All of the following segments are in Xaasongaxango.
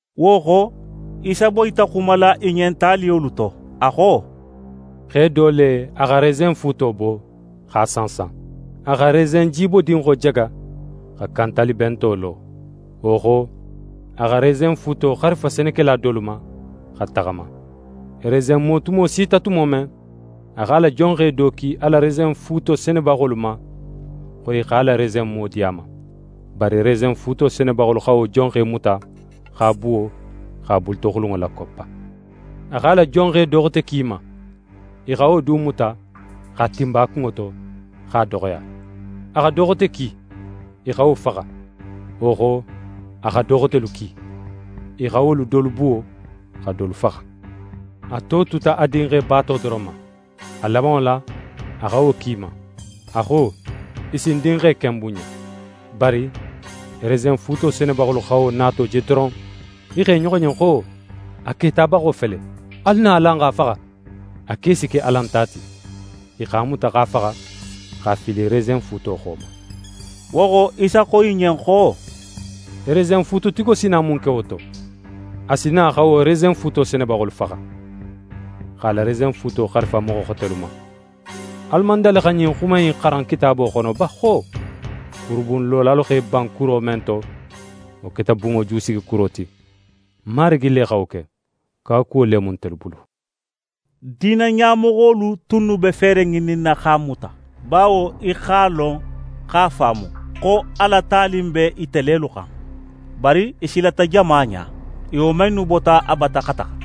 Wo xo, Isa boyita xumala i ɲen taliyolu to. A xo: «Xe do le, a xa resenfuuto bo, x'a sansan. A xa resenjibodinxo jaga, xa kantalibento lo. Wo xo, a xa resenfuuto xarifa senekela dolu ma, xa taxama. Resenmo tumo sita tumo men, a x'a la jonxe do ki a la resenfuuto senebaxolu ma, xo i x'a la resenmo di a ma. Bari resenfuuto senebaxolu xa wo jonxe muta, x'a buwo, x'a bulutoxulunŋo lakoppa. A x'a la jonxe do xote ki i ma. I xa wo du muta, x'a tinba a kunŋo to, x'a doxoya. A xa do xote ki. I xa wo faxa. Wo xo, a xa do xotelu ki. I xa wolu dolu buwo, xa dolu faxa. A to tuta a dinxe baato doron ma. A labanŋo la, a xa wo ki i ma. A xo: “I si ń dinxe ken bunɲa.” Bari resenfuuto senebaxolu xa wo nato je doron, i xo i ɲoxo ɲen xo: “A ketabaxo fele. Alu na, alan x'a faxa. A ke si ke alan ta ti.” I x'a muta, x'a faxa, x'a fili resenfuuto xo ma.» Wo xo, Isa xo i ɲen xo: «Resenfuututigo si na mun ke wo to? A si na xa wo resenfuuto senebaxolu faxa, x'a la resenfuuto xarifa moxo xotelu ma. Alu man dali xa ɲin xuma in xaran Kitaabo xono ba xo: “Kurubunlolalu x'e ban kuro men to, wo keta bunŋo jusigikuro ti. Marigi le xa wo ke. Kawakuwo le mu ntelu bulu!”» Diina ɲamoxolu tunnu be feere ŋininna x'a muta, bawo i x'a lon x'a faamu, xo a la tali in be ite lelu xan. Bari i silata jama ɲa. I woman innu bota a bata xa taxa.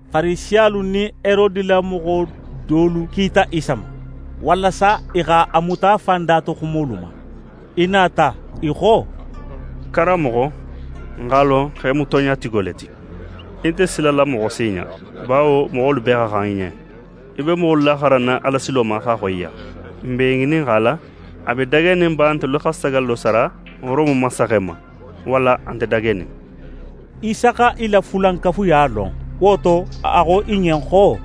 Farisiyalu nin Herode la moxo dolu kita Isa ma, walasa i x'a muta a fan datoxumolu ma. I nata, i xo: «Karanmoxo, n x'a lon xo í mu tonɲatigo le ti. Í nte silala moxo si ɲa, bawo moxolu bee xa xan í ɲen. Í be moxolu laxaranna Alasilo ma x'a xoyiya. N b'é ŋininxala, a be dagenin ba ntelu xa sagallo sara Rome mansaxe ma, walla a nte dagenin?» Isa xa i la fulankafuya lon. Wo to, a xo i ɲen xo: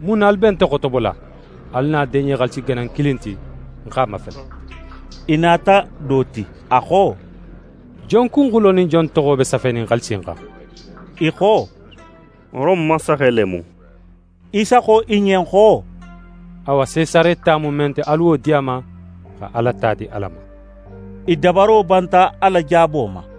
«Mun na alu be nte xotobola? Alu na deɲe xaalisi ganan kilin ti, ń x'a mafele.» I nata do ti. A xo: «Jon kunxulo nin jon toxo be safenin xaalisi in xan?» I xo: «Rome mansaxe le mu.» Isa xo i ɲen xo: «Awa, Sesare ta mu men ti, alu wo di a ma, xa Ala ta di Ala ma.» I dabaro banta a la jaabo ma.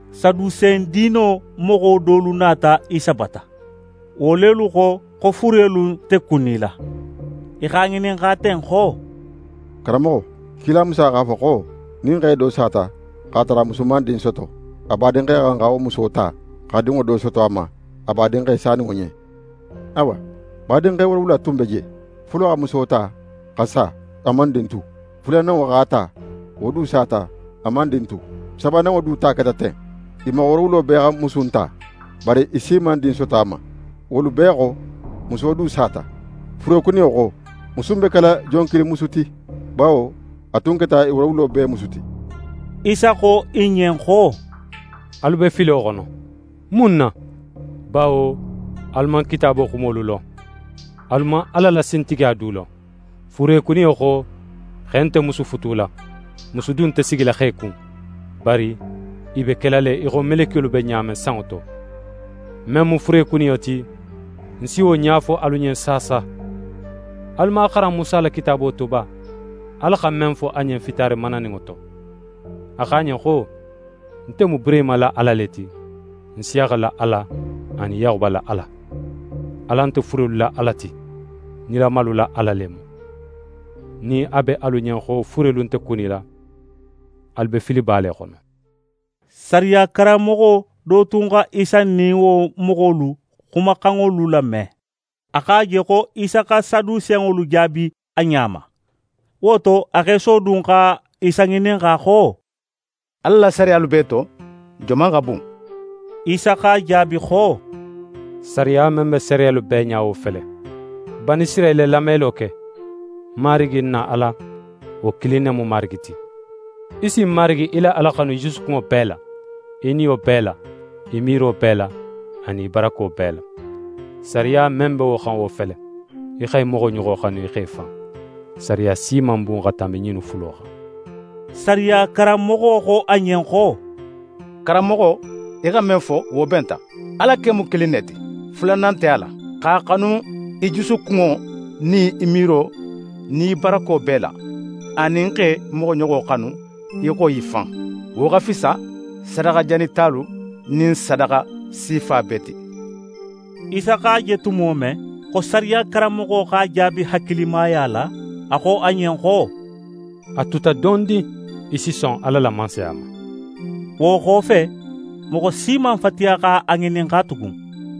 Sadusen diino moxo dolu nata Isa bata. Wo lelu xo, xo furelu nte kunila. I x'a ŋininxa ten xo: «Karanmoxo, kila Musa x'a fo xo, nin xe do sata, x'a tara a musu man din soto, a badinxe xa xan xa wo muso ta, xa dinŋo do soto a ma, a badinxe saninŋo ɲen. Awa, badinxe woorowula tun be je. Folo xa muso ta, xa sa, a man din tu. Fulananŋo x'a ta. Wo du sata, a man din tu. Sabananŋo du ta keta ten. I moxo woorowulo bee xa musu in ta, bari i si man din soto a ma. Wolu bee xo, muso du sata. Furekuniyo xo, musu in be kela jon kilin musu ti, bawo a tun keta i woorowulo bee musu ti?» Isa xo i ɲen xo: «Alu be filo xono. Mun na? Bawo alu man Kitaabo xumolu lon, alu man Ala la sintigiya du lon. Furekuniyo xo, xe nte musu futula, musu du nte sigila xe kun, bari i be kela le í xo melekiyolu be ɲa men sanŋo to. Men mu furekuniyo ti, ń si wo ɲa fo alu ɲen saasa. Alu man a xaran Musa la kitaabo to ba, Ala xa men fo a ɲen fitaare mananinŋo to? A xo a ɲen xo: “Nte mu Burehima la Ala le ti, Nsiyaxa la Ala, anin Yaxuba la Ala.” Ala nte furelu la Ala ti, nilamalu la Ala le mu. Nin a be alu ɲen xo furelu nte kunila, alu be filiba le xono.» Sariya karanmoxo do tun xa Isa nin wo moxolu xumaxanŋolu lame. A x'a je xo Isa xa Sadusenŋolu jaabi a ɲa ma. Wo to, a x'é sodun xa Isa ŋininxa xo: «Ala la sariyalu bee to joman xa bun?» Isa x'a jaabi xo: «Sariya men be sariyalu bee ɲa, wo fele: “Banisirayila, lamelo ke! Marigi, n na Ala, wo kilin ne mu Marigi ti. Í si Marigi í la Ala xanu í jusukunŋo bee la, í niyo bee la, í miiro bee la anin í barako bee la.” Sariya men be wo xan, wo fele: “Í xa í moxoɲoxo xanu í xo í fan.” Sariya si man bun xa tanbi ɲinnu fulo xan.» Sariya karanmoxo xo a ɲen xo: «Karanmoxo, í xa men fo, wo benta. Ala ken mu kilin ne ti; fulanan nte a la. X'a xanu í jusukunŋo nin í miiro nin í barako bee la, anin x'é moxoɲoxo xanu í xo í fan, wo xa fisa sadaxa janitalu nin sadaxa sifa bee ti.» Isa x'a je tumo men, xo sariya karanmoxo x'a jaabi hakilimaya la, a xo a ɲen xo: «A tuta dondin, í si son Ala la Mansaya ma.» Wo xofe, moxo si man fatiya x'a ŋininxa tugun.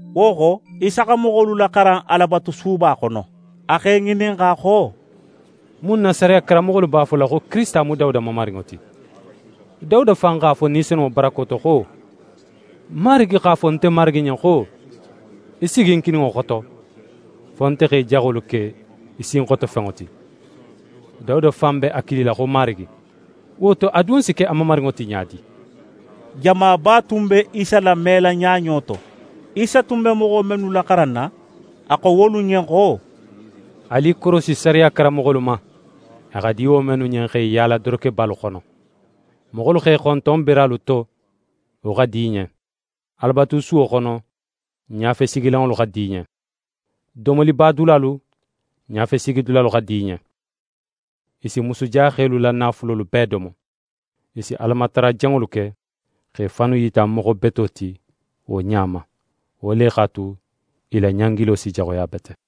Wo xo, Isa xa moxolu laxaran Alabatusuba xono. A x'e ŋininxa xo: «Mun na sariya karanmoxolu b'a fola xo Kirisita mu Dawuda Mamarinŋo ti? Dawuda fan x'a fo Ni Senunŋo barako to xo: “Marigi x'a fo nte Marigi ɲen xo: Í sigi ń kininŋo xoto, fo nte xa í jaxolu ke í sinxotofenŋo ti.” Dawuda fan be a kilila xo Marigi. Wo to, a dun si ke a mamarinŋo ti ɲa di?» Jamaba tun be Isa lamela ɲaɲo to. Isa tun be moxo mennu laxaranna, a xo wolu ɲen xo: «Alu i korosi sariya karanmoxolu ma, a xa di wo mennu ɲen x'e yaala dorokebalu xono. Moxolu x'e xonton beralu to, wo xa di i ɲen. Alabatusuwo xono, ɲafesigilanŋolu xa di i ɲen. Domolibadulalu, ɲafesigidulalu xa di i ɲen. I si musujaxelu la naafulolu bee domo. I si Alamatara janŋolu ke, x'e fannu yita moxo beto ti wo ɲa ma. Wo le x'a tu, i la ɲangilo si jaxuya bete.»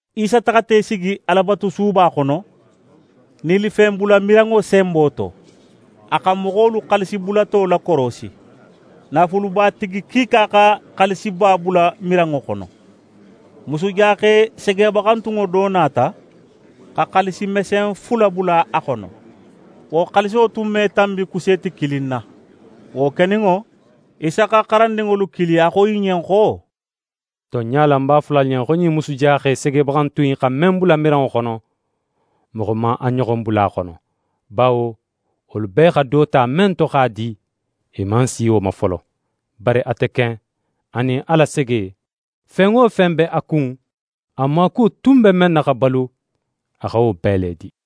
Isa taxata í sigi Alabatusuba xono, nilifenbulamiranŋo senbo to. A xa moxolu xaalisibulato lakorosi. Naafulubatigi kiika xa xaalisiba bula miranŋo xono. Musujaxe segebaxantunŋo do nata, xa xaalisi mesen fula bula a xono. Wo xaaliso tun me tanbi kuseeti kilin na. Wo keninŋo, Isa x'a la xarandinŋolu kili, a xo i ɲen xo: «Tonɲa la, ń b'a fola alu ɲen, xo ɲin musujaxe segebaxantun in xa men bula miranŋo xono, moxo man a ɲoxon bula a xono. Bawo wolu bee xa do ta men to x'a di, i man si wo ma folo, bari ate ken; a nin a la sege, fen wo fen be a kun, a maakuwo tun be men na xa balu, a xa wo bee le di.»